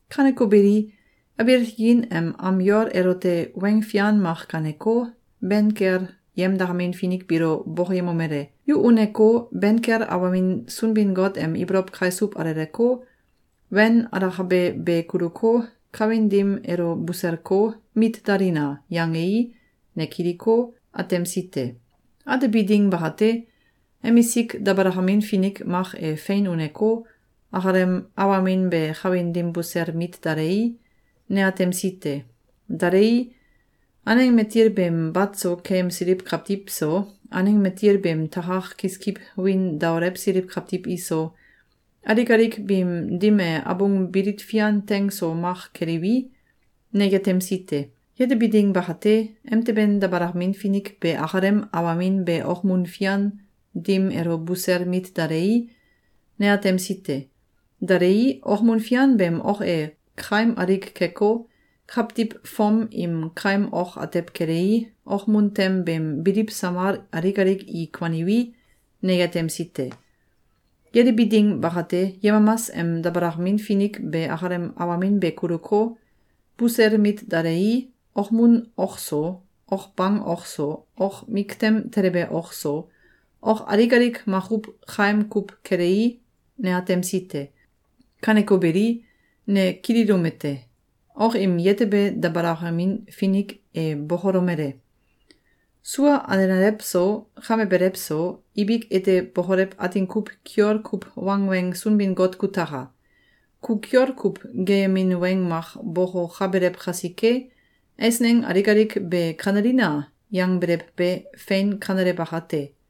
Kaneko beli, abiil tikin em am yol elote weng fian mak gaaneko, ben kel yemdakamin finik biilo bokoyemomele: “Yu uneko, ben kel awamin Sunbin-Got em ibolow kaisuw aleleko, wen alakabe be kuluko, kawin dim elo buselko, mit dalina!”, yangei, ne kiliko, atemsi te. Atebi ding bakate, emisik dabalakamin finik mak e fein uneko, akalem awamin be kawin dim busel mit dalei, ne atemsi te. Dalei, aneng matil beem bat so keyemsiliw kawtiw so, aneng matil beem takak kiskiw wiin daolewsiliw kawtiw iso, alik alik biim dim e abung bilit fian teng so mak keliwi, ne yetemsi te. Yetebi ding bakate, emteben dabalakamin finik be akalem awamin be okmun fian dim elo busel mit dalei, ne atemsi te. Dalei, okmun fian beem ok e kaim alik keko, kawtiw fom im kaim ok atew kelei, okmun tem beem biliw samal alik alik i kuaniwi, ne yetemsi te. Yetebi ding bakate, yemamas em dabalakamin finik be akalem awamin be kuluko, busel mit dalei, okmun ok so, ok bang ok so, ok miktem telebe ok so, ok alik alik makuw kaim kuw kelei, ne atemsi te. Kaneko beli, ne kililomete: Ok im yetebe dabalakamin finik e bokolomele: “Sua alenalew so, kame belew so, ibik ete bokolew atin kuw kiol kuw wangweng Sunbin-Got kutaka! Ku kiol kuw geeyemin weng mak bokokabelew kasike, eisneng alik alik be ‘Kanelina!’, yangbelew be, fein kanele bakate.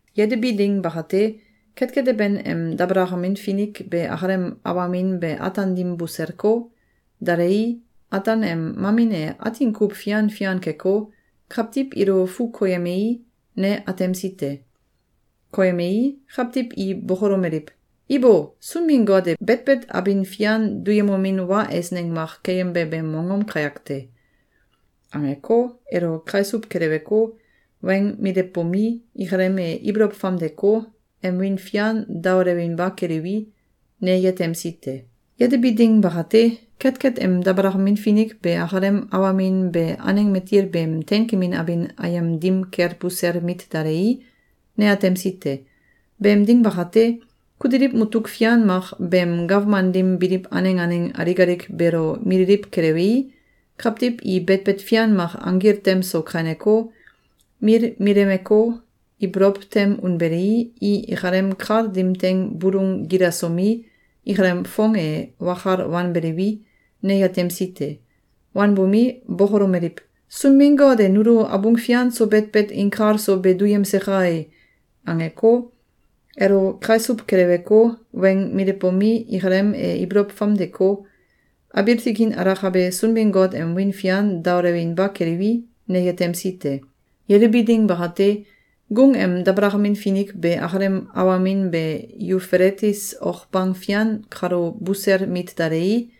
Yetebi ding bakate, ketket teben em dabalakamin finik be akalem awamin be ataan dim buselko, dalei, ataan em mamin e atin kuw fian fian keko, kawtiw ilo fu koyemei, ne atemsi te. Koyemei, kawtiw i bokolomeliw: “Ibo! Sunbin-Got e betbet abin fian duyemomin wa eisneng mak keyembe beem mongom kayak te!”, angeko, elo kaisuw keleweko, weng milewbomi, ikalem e ibolow famdeko, em wiin fian daolewinba keliwi, ne yetemsi te. Yetebi ding bakate, ketket em dabalakamin finik be akalem awamin be aneng matil beem teinkemin abin ayem dim kel busel mit dalei, ne atemsi te. Beem ding bakate, kutiliw mutuk fian mak beem gawman dim biliw aneng aneng alik alik beelo mililiw kelewei, kawtiw i betbet fian mak anggil tem so kaineko, milmilemeko, ibolow tem unbelei, i ikalem kal dim teing bulung gilasomi, ikalem foong e wakal wanbeliwi, ne yetemsi te. Wanbomi, bokolomeliw: “Sunbin-Got e nulo abung fian so betbet inkal so be duyemse kai!”, angeko, elo kaisuw keleweko, weng milewbomi, ikalem e ibolow famdeko, abiil tikin alakabe Sunbin-Got em wiin fian daolewinba keliwi, ne yetemsi te. Yetebi ding bakate, gung em dabalakamin finik be akalem awamin be Yufeletis ok bang fian kalo busel mit dalei,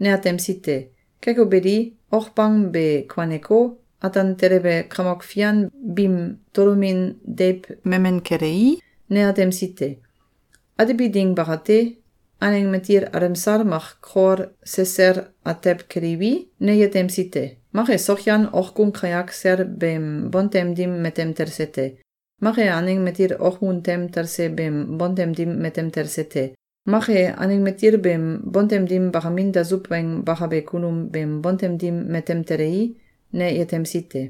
ne atemsi te. Keko beli, ok bang be kuaneko, ataan telebe kamok fian biim tolomin deiw memen kelei, ne atemsi te. Atebi ding bakate, aneng matil alemsal mak kol sesel atew keliwi, ne yetemsi te. Mak e sokyan okgung kayak sel beem bontem dim matem talse te. Mak e aneng matil okmun tem talse beem bontem dim matem talse te. Mak e aneng matil beem bontem dim bakamin dasuw weng bakabe kunum beem bontem dim matem telei, ne yetemsi te.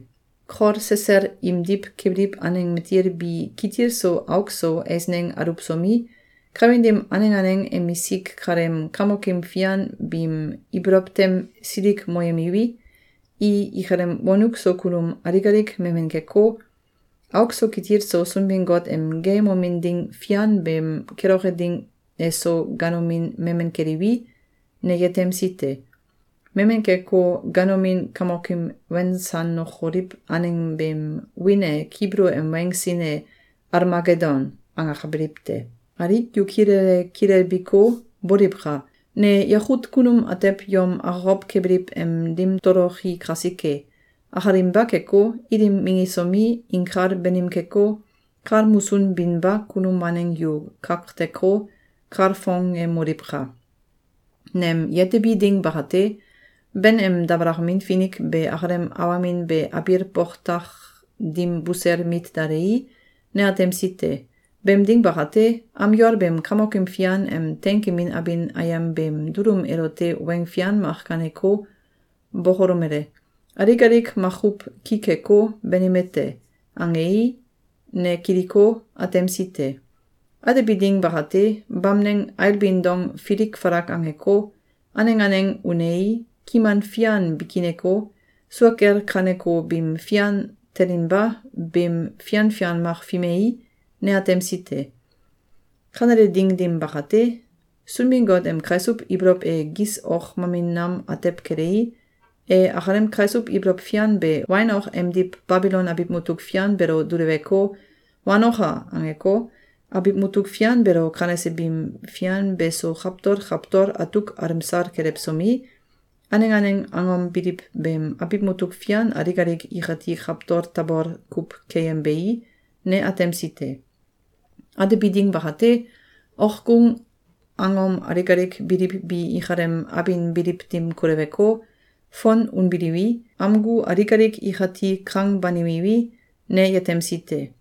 Kol sesel imdiw kebiliw aneng matil bi kitil so auk so eisneng aluwsomi, kawin dim aneng aneng emisik kaleem kamokim fian biim ibolow tem silikmoyemiwi, i ikalem wonuk so kunum alik alik memen keko, auk so kitil so Sunbin-Got em geeyemomin ding fian beem keloke ding eso ganomin memen keliwi, ne yetemsi te. Memen keko, ganomin kamokim wensanokoliw aneng beem wiin e Kibulu em weng sin e “Almagedon”, angakabiliw te. Alik yu kilele kilelbiko, boliwka! Ne yakut kunum atew yom akokow kebiliw em ding toloki kasike! Akalinba keko, ilim minggisomi, inkal banim keko, kal musun binba kunum waneng yu kakteko, kalfongemoliwka! Nem yetebi ding bakate, ben em dabalakamin finik be akalem awamin be abiil boktak dim busel mit dalei, ne atemsi te. Beem ding bakate, am yol beem Kamokim Fian em teinkemin abin ayem beem dulum elote weng fian mak gaaneko, bokolomele: “Alik alik makuw ki keko, banime te!”, angei, ne kiliko, atemsi te. Atebi ding bakate, bamneng ailbin dong filik falak angeko, aneng aneng unei, kiman fian bikineko, sua kel kaneko bim fian telinba bim fian fian mak fimei, ne atemsi te. Kanele ding dim bakate, Sunbin-Got em kaisuw ibolow e gis ok mamin nam atew kelei, e akalem kaisuw ibolow fian be wain ok emdiw Babilon abiw mutuk fian beelo duleweko, “Wanoka!”, angeko, abiw mutuk fian beelo kanese bim fian beso kawtol kawtol atuk alemsal kelewsomi, aneng aneng angom biliw beem abiw mutuk fian alik alik ikati kawtol tabol kuw keyembei, ne atemsi te. Atebi ding bakate, okgung angom alik alik biliw bi ikalem abin biliw dim koleweko, fon unbiliwi, amgu alik alik ikati kang banimiwi, ne yetemsi te.